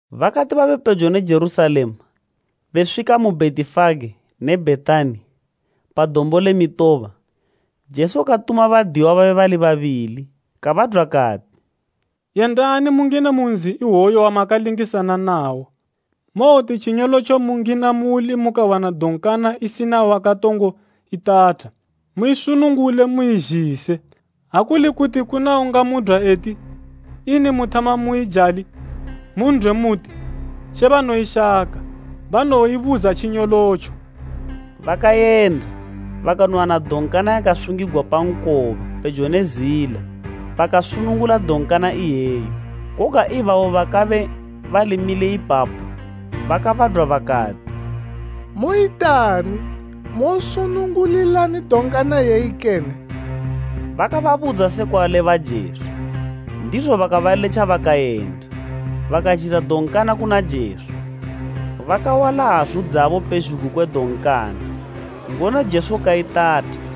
Bakati babe pejo ne Jerusalema, beswika mu Bhetifage ne Bhetani pa Dombo le Mitoba, Jesu katuma badiyiwa babe bali babili. Kabadwa kati, “Yendani mungine mu nzi iwoyu wamakalingisana nawo, mowoti tjinyolotjo mungina muuli mukawana donkana isina wakatongo itatha, muisunungule muizhise. Ha kuli kuti kuna ungamudwa eti, ‘Ini muthama muijali?’ mun'dwe muti, ‘She banoyishaka, banowoibuza tjinyolotjo.’” Bakayenda bakanowana donkana yakasungigwa pa nkoba pejo ne zila. Bakasunungula donkana iyeyo. Koga ibabo bakabe bali mile ipapo bakabadwa bakati, “Moyitani, mosunungulilani donkana iyeyi kene?” Bakababudza sekwa leba Jesu. Ndizo bakabaletja bakayenda. Bakazhisa donkana kuna Jesu. Bakawala hazu dzabo pezhugwi kwe donkana, ngono Jesu kaitatha.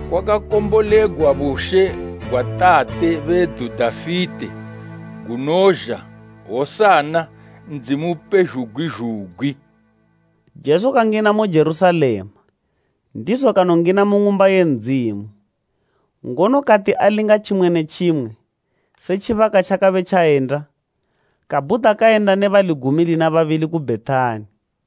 Kwakakombolegwa bushe gwa tate bedu Dafite, gunozha! Hosana, Ndzimu Upezhugwi zhugwi.” Jesu kangina mu Jerusalema, ndizo kanongina mu Ng'umba ye Ndzimu, ngono kati alinga tjimwe ne tjimwe, se tjibaka tjakabe tjayenda, kabhuda kayenda ne bali gumi lina babili ku Bhetani.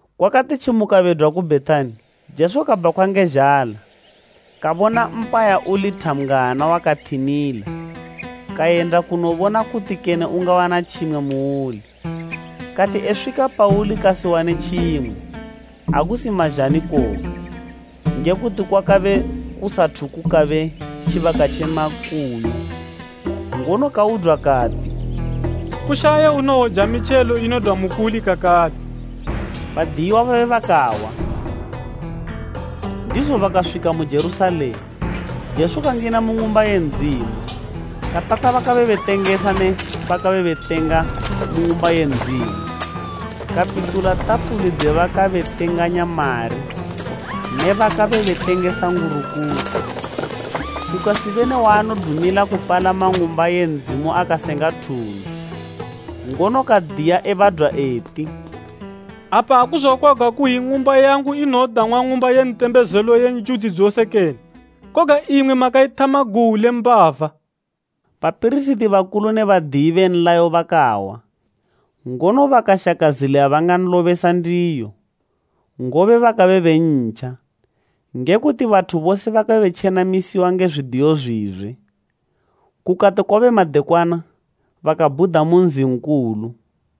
Kwakati tjimuka bedwa ku Bhetani, Jesu kabhakhwa nge zhala. Kabona mpaya uli thambgwana wakathinila, kayenda kunobona kuti kene ungawana tjimwe muuli. Kati eswika pauli kasiwane tjimwe, ha kusi mazhani koga, nge kuti kwakabe kusathu kukabe tjibaka tje makuyu. Ngono kaudwa kati, “Kushaye unowoja mitjelo inodwa mukuli kakale.” Badiyiwa babe bakahwa. Ndizo bakaswika mu Jerusalema, Jesu kangina mu Ng'umba ye Ndzimu, katata bakabe betengesa ne bakabe betenga mu Ng'umba ye Ndzimu. Kapitula tafuli dze bakabe betenganya mari ne bakabe betengesa ngurukuku. Kukasibe ne waanodumila kupalama Ng'umba ye Ndzimu akasenga thundu. Ngono kadiya, ebadwa eti, “Apa akuzokwagwa kuyi, ‘Ng'umba yangu inowodang'wa Ng'umba ye Ntembezelo ye njudzi dzose kene?’ Koga imwi makaithama guwu le mbava.” Bapirisiti bakulu ne badiyi be nlayo bakahwa, ngono bakashaka zila yabanganlobesa ndiyo, ngobe bakabe bentja, nge kuti bathu bose bakabe betjenamisiwa nge zwidiyo zwizwe. Kukati kwabe madekwana, bakabhuda mu nzi nkulu.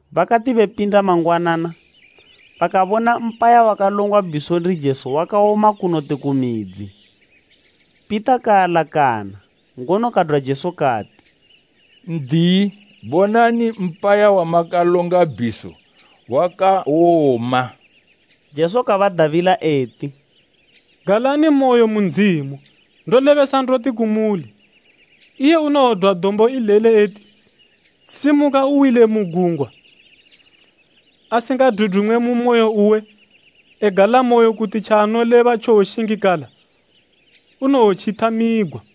Bakati bepinda mangwanana, bakabona mpaya wakalongwa bhiso ndi Jesu wakawoma kunoti ku midzi. Pita kaalakana, ngono kadwa Jesu kati, “N'diyi, bonani, mpaya wamakalonga bhiso wakawoma.” Jesu kabadabila eti, “Galanimoyo mu Ndzimu. Bakorinta 13:2Ndolebesa ndoti kumuli, iye unowodwa dombo ileli eti, ‘Simuka uwile mu gungwa,’ asingadudumwe mu moyo uwe, egalamoyo kuti tjaanoleba tjowoshingikala, unowotjithamigwa.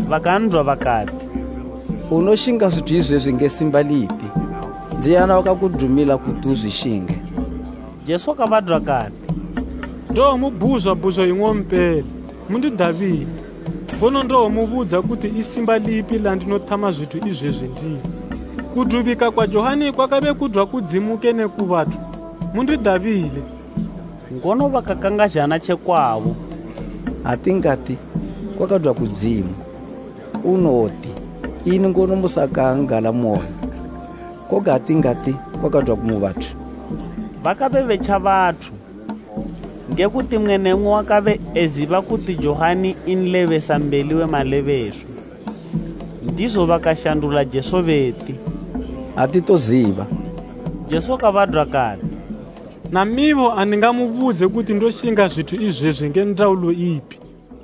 bakan'dwa bakati, “Unoshinga zwithu izwezwi nge simba lipi? Ndiani wakakudumila kuti uzwishinge?” Jesu kabadwa kati, “Ndowomubhuzwa bhuzo ing'ompela, mundidabile, ngono ndowomubudza kuti i simba lipi landinothama zwithu izwezwi ndilo. Kudubika kwa Johani kwakabe kudwa kudzimu kene ku bathu? Mundidabile.” Ngono bakakangazhana tje kwabo, “Ha tingati, ‘Kwakadwa kudzimu,’ unowoti ‘Ini ngono musakan'galamoyo?’ Koga ha tingati, ‘Kwakadwa mu bathu…’” Bakabe betja bathu, nge kuti mmwe ne mmwe wakabe eziba kuti Johani nlebesambeli we malebeswa. Ndizo bakashandula Jesu beti, “Atitoziba.” Jesu kabadwa kati, “Namibo andingamubudze kuti ndoshinga zwithu izwezwi nge ndaulo ipi.”